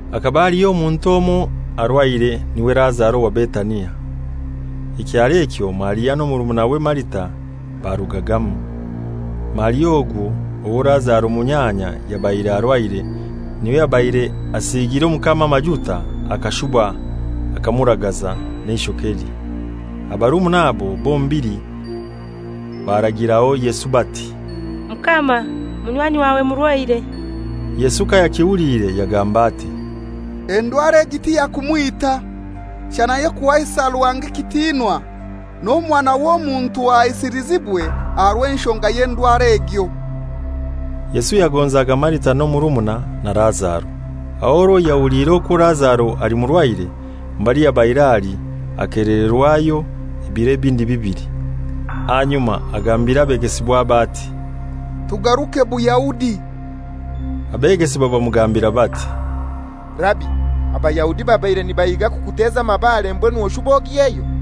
Hakaba haliho omuntu omoi arwaire, n'iwe Lazaro owa Betania, ekyaro ekyo Maria n'omurumuna Marita barugagamu. Maria ogwo owo Lazaro, munyanya, yabaire arwaire, n'iwe yabaire asiigire Omukama amajuta akashuba akamuragaza n'eishokelye. Abarumuna abo bombili baragiraho Yesu bati, «Mukama, munywanyi wawe murwaire.» Yesu kayaikihuliire yagamba ati, «Endwara egi tiyakumwita, shana y'okuhaisa Ruhanga ekitinwa, n'Omwana w'Omuntu ahaisilizibwe aha rw'enshonga y'endwara egyo.» Yesu yagonzaga Marita n'omurumuna na Lazaro. Aho orwo yahuliire okwo Lazaro ali murwaire, mbali yabaire ali akelererwayo ebiro ebindi bibili. Ahanyuma agambira abegesibwabe ati, «Tugaruke Buyahudi.» Abegesibwa bamugambira bati, «Rabi, Abayahudi babaire nibahiga kukuteza amabare, mbwenu oshube ogyeyo?»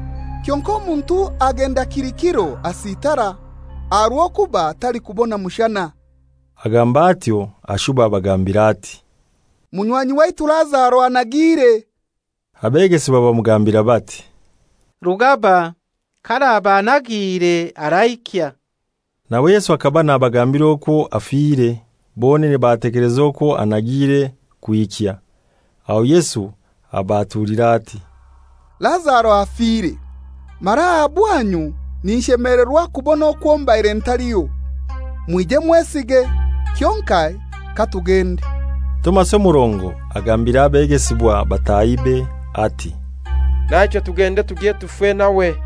Kyonkai omuntu agenda kili kiro asitara, aha rw'okuba talikubona mushana.» Agamba atyo, ashuba abagambira ati, «Munywanyi waitu Lazaro anagiire.» Abegesibwa bamugambira bati, «Rugaba, k'araba anagiire araikya.» Nawe Yesu hakaba nabagambira okwo afire, bonene batekeleza okwo anagire kwikya. Aho Yesu abaatulira ati, «Lazaro afire; mara aha bwanyu ninshemelerwa kubona okwo mbaire ntaliho, mwije mwesige. Kyonkai katugende.» Tomasi omurongo agambira abegesibwa batahibe ati, «Naichwe tugende tugye tufe nawe.»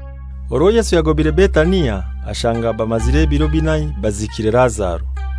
Orwo Yesu yagobire Betania, ashanga bamazire ebiro binai baziikire Lazaro.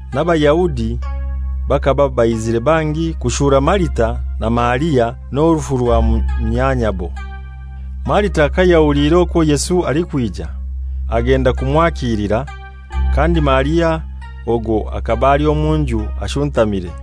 n'Abayahudi bakaba baizire bangi kushura Marita na Maria n'orufu rwa munyanyabo. Marita kayahuliire okwo Yesu alikwija, agenda kumwakilira, kandi Maria ogwo hakaba ali omu nju ashuntamire.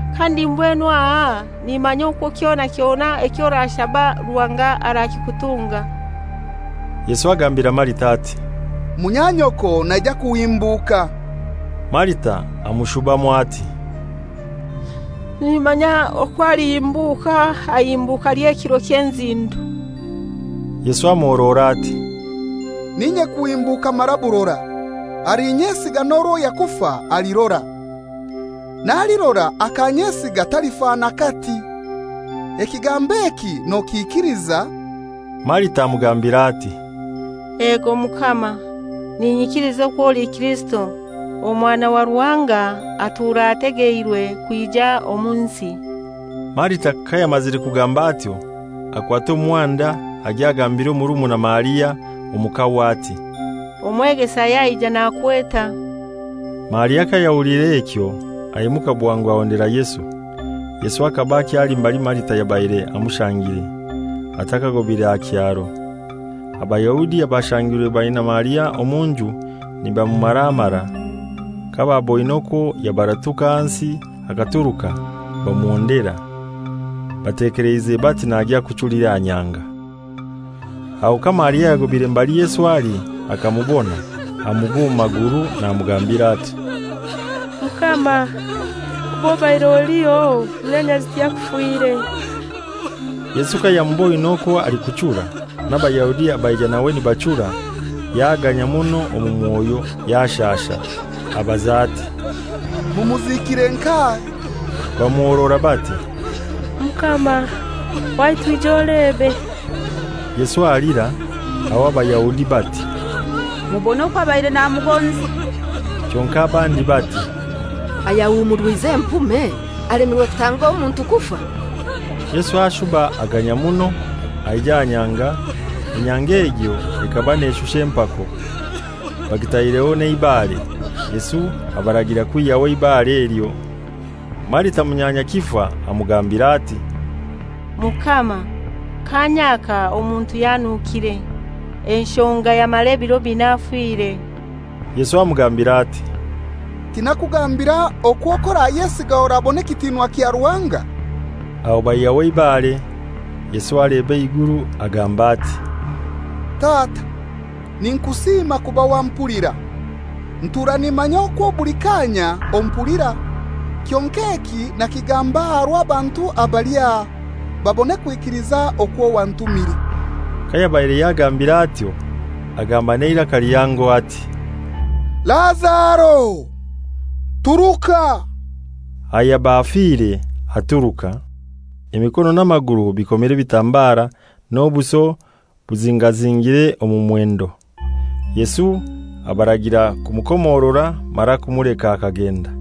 Kandi mbwenu aha nimanya okwo kyona kyona eky'orashaba Ruhanga arakikutunga.» Yesu agambira Marita ati, «Munyanyoko naija kuhimbuka.» Marita amushubamu ati, «Nimanya okwo alihimbuka aha ihimbuka ely'ekiro ky'enzindo.» Yesu amuhorora ati, «N'inye kuhimbuka mara burora; alinyesiga n'orwo yakufa, alirora. N'alirora akanyesiga talifa n'akati. Ekigambo eki nokikiliza?» Marita amugambira ati, «Ego Mukama, ninyikiliza okwo oli Kirisito, Omwana wa Ruhanga, atura ategeirwe kwija omu nsi.» Marita kayamazire kugamba atyo, akwata omuhanda agya agambira omurumuna Maria omu kahwe ati, «Omwegesa yaija, nakweta.» Maria kayahuliire ekyo, aimuka bwangu ahondera Yesu. Yesu hakaba akyali mbali Marita yabaire amushangire, atakagobire aha kyaro. Abayahudi abashangirwe baina Maria omu nju nibamumaraamara, kabaaboine okwo yabaratuka ahansi akaturuka, bamuhondera, batekeleize bati nagya kuchulira aha nyanga. Aho ka Maria yagobire mbali Yesu ali akamubona, amugwa omu maguru namugambira ati, «Mukama, kuba obaire oliho, munyanyazi tiyakufire.» Yesu kayamuboine okwo alikuchura, n'Abayahudi abaija nawe nibachura, yaganya muno omu mwoyo, yashasha; abaza ati, «Mumuziikire nkahai?» Bamuhorora bati, «Mukama, waitu ija olebe.» Yesu alira. Aho Abayahudi bati, «Mubone okwo abaire namugonza!» Kyonkai abandi bati, «Ayahumurwize empume alemirwe kutanga omuntu kufa?» Yesu ashuba aganya muno; aija aha nyanga. Enyanga egyo ekaba neshusha empako, bagitaireho n'eibare. Yesu abaragira kwihyaho eibare elyo. Marita munyanya kifa amugambira ati, «Mukama, kaanya aka omuntu yanukire, enshonga yamara ebiro binai afire.» Yesu amugambira ati, «Tinakugambira okwo k'orayesiga orabona ekitinwa kya Ruhanga?» Aho baihyaho eibare. Yesu aleba eiguru agamba ati, «Tata, ninkusiima kuba wampulira. Ntuura nimanya okwo buli kaanya ompulira, kyonkai eki nakigamba aha rw'abantu abali aha, babone kwikiliza okwo wantumire.» Kayabaire yagambiire atyo, agamba n'eiraka lihango ati, «Lazaro, turuka!» Ayaba afire aturuka, emikono n'amaguru bikomire ebitambara, n'obuso buzingazingire omu mwendo. Yesu abaragira kumukomorora mara kumuleka akagenda.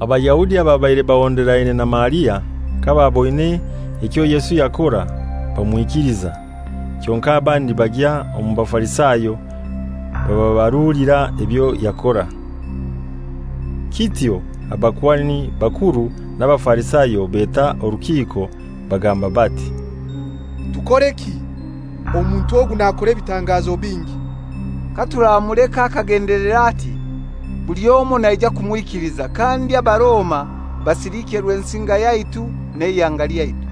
Abayahudi ababaire bahonderaine na Maria kabaaboine ekyo Yesu yakora, bamwikiliza. Kyonkai abandi bagya omu Bafarisayo bababarulira ebyo yakora. Kityo abakuhani bakuru n'Abafarisayo beta orukiiko, bagamba bati, «Tukoreki? Omuntu ogu nakora ebitangazo bingi. Katuramuleka akagendelera ati, buli omoi naija kumwikiliza, kandi Abaroma basilikye Rwensinga yaitu n'eihanga lyaitu.»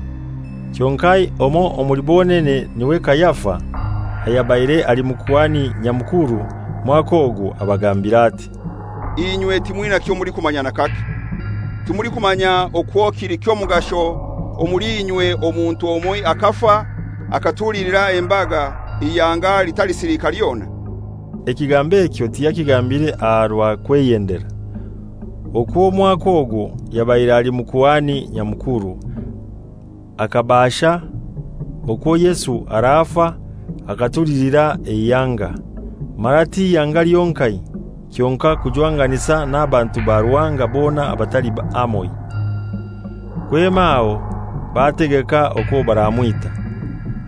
Kyonkai omoi omuli bonene n'iwe Kayafa ayabaire ali Mukuhani Nyamukuru mwaka ogwo, abagambira ati, «Inywe timwina kyomulikumanya n'akake. Timulikumanya okwo kili ky'omugasho omuli inywe omuntu omoi akafa akatulilira embaga eihanga litalisiliika lyona?» Ekigambo ekyo tiyakigambire aha rwa kweyendera. Okwo omwaka ogwo yabaire ali Mukuhani Nyamukuru, akabaasha okwo Yesu arafa akatulilira eihanga, mara ti ihanga lyonkai, kyonkai kujwanganisa n'abantu ba Ruhanga bona abatali hamoi. Kwema aho bategeka okwo baramwita.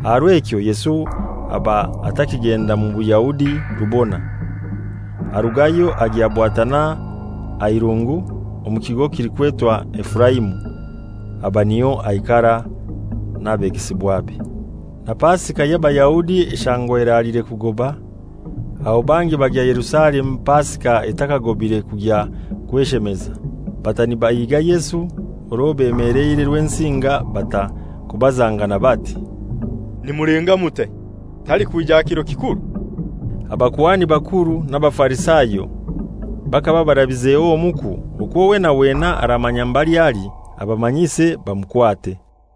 Aha rw'ekyo Yesu aba atakigenda mu Bayahudi rubona. Arugayo agya bwatana aha irungu, omu kigo kilikwetwa Efuraimu; aba niyo aikara n'abegesibwabe. Na Pasika y'Abayahudi eshangwa eraliire kugoba, aho bangi bagya Yerusalemu Pasika etakagobire kugya kweshemeza. Bata nibahiga Yesu, orwo bemeleire Rwensinga bata kubazangana bati, «Nimulenga mutai? Talikwija aha kiro kikuru?» Abakuhani bakuru n'Abafarisayo bakaba barabizeho omuku okwo wena wena aramanya mbali ali abamanyise, bamukwate.